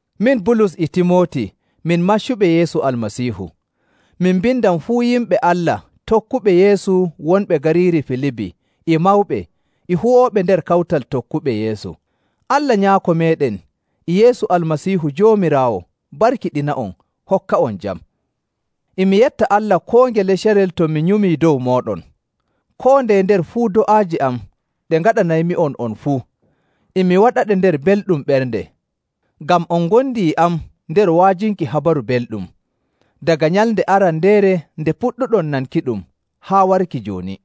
Min Bulus e Timooti min maccuɓe Yeesu Almasiihu.. Min mbindan fuu yimɓe Allah tokkuɓe Yeesu wonɓe gariiri Filibi e mawɓe e huwooɓe nder kawtal tokkuɓe Yeesu. Allah Nyaako meeɗen e Yeesu Almasiihu Joomiraawo barkiɗina'on hokka'on jam. E mi yetta Allah koo ngele carel to mi nyumii dow mooɗon. Koo ndeye nder fuu do'aaje am ɗe ngaɗanaymi'on on fuu, e mi waɗaɗe nder belɗum ɓernde, ngam on ngondi e am nder wa'ajinki Habaru Belɗum, daga nyalnde arandeere nde puɗɗuɗon nankiɗum haa warki jooni.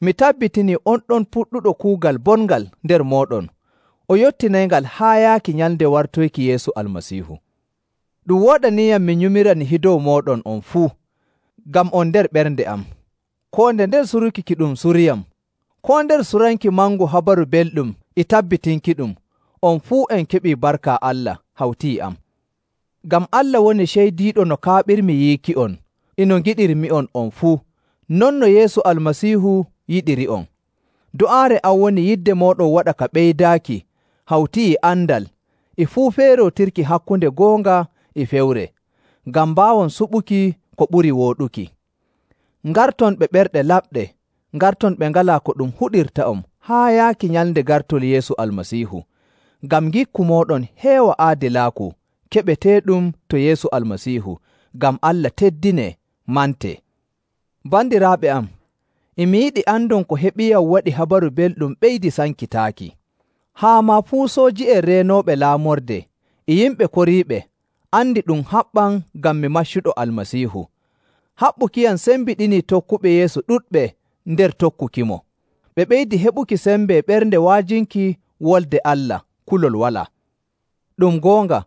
Mi tabbitinii on ɗon puɗɗuɗo kuugal bongal nder mooɗon o yottinayngal haa yaaki nyalnde wartoyki Yeesu Almasiihu. Ɗum wooɗaniiyam mi nyumira nihi dow mooɗon on fuu, ngam on nder ɓernde am. Koo nder suruki ki ɗum suriyam, koo nder suranki mangu Habaru Belɗum e tabbitinkiɗum, on fuu on keɓii barka Allah hawti e am. Ngam Allah woni ceydiiɗo no kaaɓirmi yiiki'on e no ngiɗirmi'on, on fuu, non no Yeesu Almasiihu yiɗiri'on. Do'aare am woni yidde mooɗon waɗa ka ɓeydaaki hawti e andal e fuu feerootirki hakkunde goonga e fewre, ngam mbaawon suɓuki ko ɓuri wooɗuki, ngarton ɓe ɓerɗe laɓɗe, ngarton ɓe ngalaa ko ɗum huɗirta'on haa yaaki nyalnde gartol Yeesu Almasiihu, ngam ngikku mooɗon heewa aadilaaku keɓeteeɗum to Yeesu Almasiihu, ngam Allah teddinee, mantee. Bandiraaɓe am, e mi yiɗi andon ko heɓiyam waɗii Habaru Belɗum ɓeydii sankitaaki, haa maa fuu sooji'en reenooɓe laamorde e yimɓe koriiɓe andii ɗum haɓɓam ngam mi maccuɗo Almasiihu.. Haɓɓukiyam sembiɗinii tokkuɓe Yeesu ɗuɗɓe nder tokkukimo, ɓe ɓeydii heɓuki sembe ɓernde wa'ajinki Wolde Allah kulol walaa. Ɗum goonga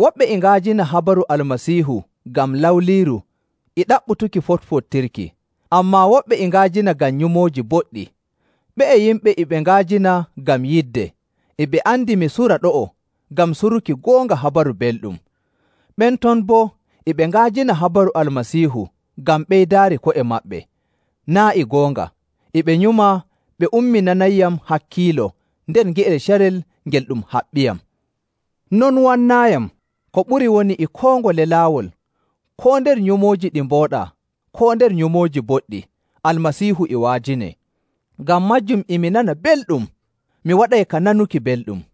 woɓɓe e nga'ajina habaru Almasiihu ngam lawliiru e ɗaɓɓutuki foɗfoɗtirki, ammaa woɓɓe e nga'ajina ngam nyumooji boɗɗi. Ɓe'e yimɓe e ɓe nga'ajina ngam yidde, e ɓe andi mi sura ɗo'o ngam suruki goonga Habaru Belɗum. Ɓen ton boo e ɓe nga'ajina habaru Almasiihu ngam ɓeydaari ko'e maɓɓe, naa' e goonga, e ɓe nyuma ɓe umminanayyam hakkiilo nder nge'el carel ngel ɗum haɓɓiyam. Non wannaayiyam! Ko ɓuri woni e koo ngole laawol, koo nder nyumooji ɗi mbooɗaa, koo nder nyumooji boɗɗi, Almasiihu e wa'ajinee. Ngam maajum e mi nana belɗum! Mi waɗay ka nanuki belɗum.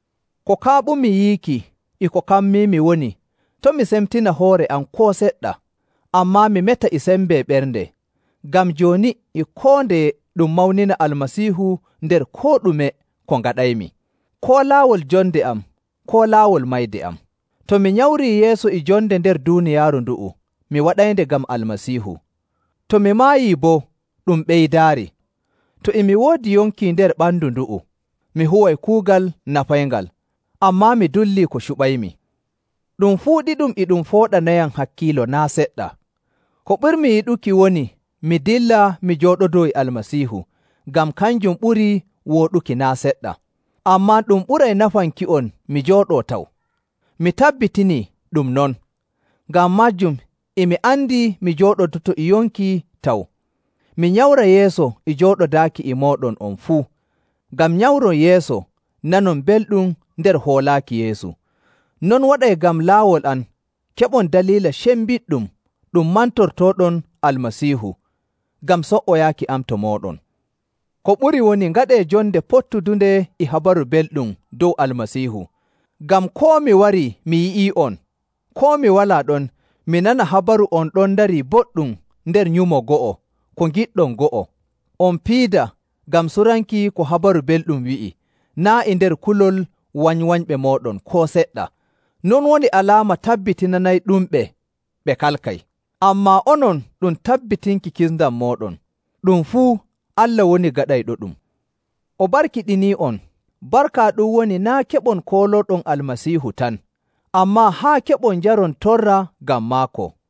Ko kaaɓumi yiiki e ko kammiimi woni to' mi semtina hoore am koo seɗɗa, ammaa mi meta e sembe ɓernde, ngam jooni e koo ndeye ɗum mawnina Almasiihu nder koo ɗume ko ngaɗaymi, koo laawol jonde am, koo laawol mayde am. To mi nyamrii yeeso e jonde nder duuniyaaru ndu'u, mi waɗaynde ngam Almasiihu. To mi maayii boo, ɗum ɓeydaari. To e mi woodi yonki nder ɓandu ndu'u, mi huway kuugal nafayngal. Ammaa mi dullii ko cuɓaymi. Ɗum fuu ɗiɗum e ɗum fooɗanayam hakkiilo naa' seɗɗa. Ko ɓurmi yiɗuki woni mi dilla mi jooɗodoo e Almasiihu, ngam kanjum ɓuri wooɗuki naa' seɗɗa. Ammaa ɗum ɓuray nafanki'on mi jooɗoo taw. Mi tabbitinii ɗum non. Ngam maajum e mi andi mi jooɗodoto e yonki taw, mi nyamra yeeso e jooɗodaaki e mooɗon on fuu, ngam nyamron yeeso, nanon belɗum nder hoolaaki Yeesu. Non waɗay ngam laawol am keɓon daliila cembiɗɗum ɗum mantortooɗon Almasiihu ngam so''oyaaki am to mooɗon. Ko ɓuri woni ngaɗee jonde pottudunde e Habaru Belɗum dow Almasiihu, ngam koo mi warii mi yi'i'on, koo mi walaa ɗon, mi nana habaru on ɗon ndarii boɗɗum nder nyumo go'o, ko ngiɗɗon go'o. On piida ngam suranki ko Habaru Belɗum wi'i, naa' nder kulol wanywanyɓe mooɗon koo seɗɗa. Non woni alaama tabbitinanayɗumɓe ɓe kalkay, ammaa onon ɗum tabbitinki kisndam mooɗon. Ɗum fuu Allah woni gaɗayɗoɗum. O barkiɗinii'on. Barka ɗum woni naa' keɓon koolooɗon Almasiihu tan, ammaa haa keɓon njaron torra ngam maako.